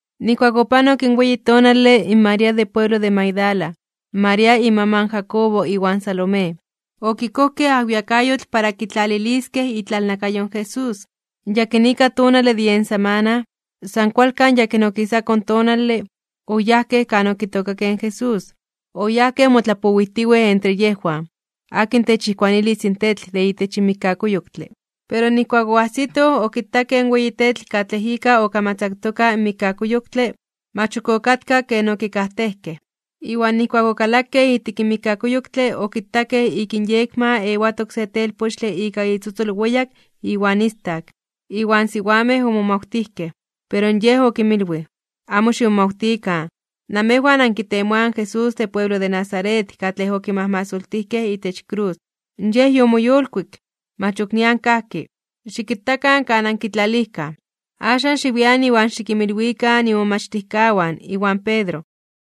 Nijkuak opanok in weyi tonale, in María de pueblo de Magdala, in María imaman Jacobo iwan Salomé, okikojkej ajwiakayotl para kitlaliliskej itlalnakayo in Jesús. In yakinika tonale de yen samana, san kualkan yakin okisako tonale, oyajkej kan okitookakej in Jesús. Oyayaj motlapowijtiwej entre yejwan: ―¿Akin techijkuanilis in tetl de itech mikkakuyoktle? Pero nijkuak oajsitoj, okitakej in weyi tetl katlej ika okamatzaktoka in mikkakuyoktle, mach ok okatka ken okikajtejkej. Iwan nijkuak okalakej ijtik in mikkakuyoktle okitakej ik inyekma ewatok se telpochtle ika itzotzol weyak iwan istak. Iwan siwamej omomawtijkej. Pero yej okinmilwij: ―Amo ximomawtikan, namejwan ankitemoaj in Jesús de pueblo de Nazaret katlej okimajmasoltijkej itech krus, ¡Yej yomoyolkuik! ¡Mach ok nian kajki! Xikitakan kan ankitlalijkaj. Axan xiwian iwan xikinmilwikan imomachtijkawan iwan Pedro,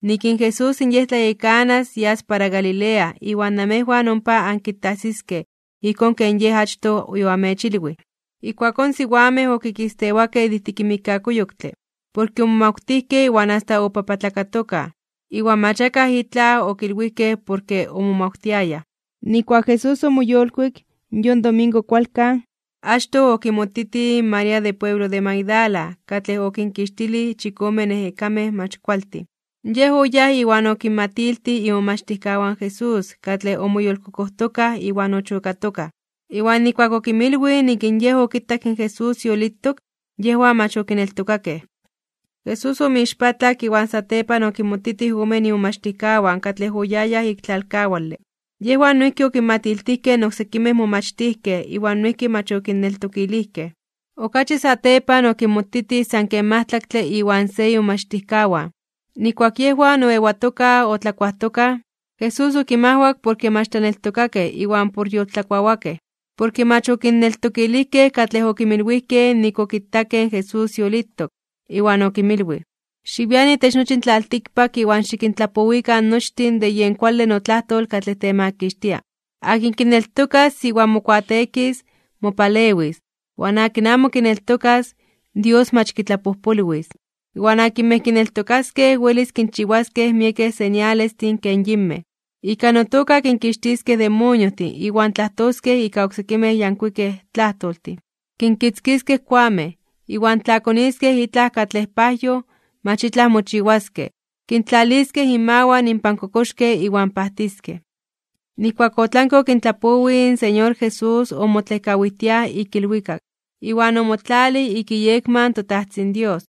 nik in Jesús Yej tlayekanas yas para Galilea iwan namejwan ompa ankitajsiskej ijkón ken Yej achtoj yoamechilwij. Ijkuakón in siwamej okikistewakej de ijtik in mikkakuyoktle, porke omomawtijkej iwan asta opapatlakatokaj (obibiokatokaj), iwan mach akaj itlaj okilwijkej porke omomawtiayaj. Nijkuak Jesús omoyolkuik, yon domingo kualkan, achtoj okimotitij in María de pueblo de Magdala katlej okinkixtilij chikome ejekamej mach kualtin. Yej oyáj iwan okinmatiltij imomachtijkawan Jesús katlej omoyolkokojtokaj iwan ochokatokaj. Iwan nijkuak okinmilwij nik in yej okitak in Jesús yolitok, yejwan mach okineltokakej. Jesús omoixpatlak iwan satepan okinmotitij omen imomachtijkawan katlej oyayaj ik tlalkawale. Yejwan noijki okinmatiltijkej in oksekimej momachtijkej iwan noijki mach okinneltokilijkej. Okachi satepan okinmotitij san ken majtlaktle iwan se imomachtijkawan, nijkuak yejwan oewatokaj otlakuajtokaj. Jesús okinmajwak porke mach tlaneltokakej iwan por yoltlakuawakej, porke mach okinneltokilijkej katlej okinmilwijkej nik okitakej in Jesús yolitok. Iwan okinmilwij: ―Xiwian itech nochi in tlaltikpak iwan xikintlapowikan nochtin de yen kuale notlajtol katlej temakixtia. Akin kineltokas iwan mokuateekis, mopalewis. Iwan akin amo kineltokas, Dios mach kitlapojpolwis. Iwan akinmej kineltokaskej welis kinchiwaskej miekej señalestin ken yinmej: Ika notoka kinkixtiskej demoniojtin iwan tlajtoskej ika oksekimej yankuikej tlajtoltin. Kinkitzkiskej koamej, iwan tla koniskej itlaj katlej pajyoj, mach itlaj mochiwaskej, kintlaliskej inmawan inpan kokoxkej iwan pajtiskej. Nijkuak otlanke okintlapowij, in Señor Jesús omotlejkawijtiaj (otlejkok) ik ilwikak, iwan omotlalij ik iyekma in toTajtzin Dios.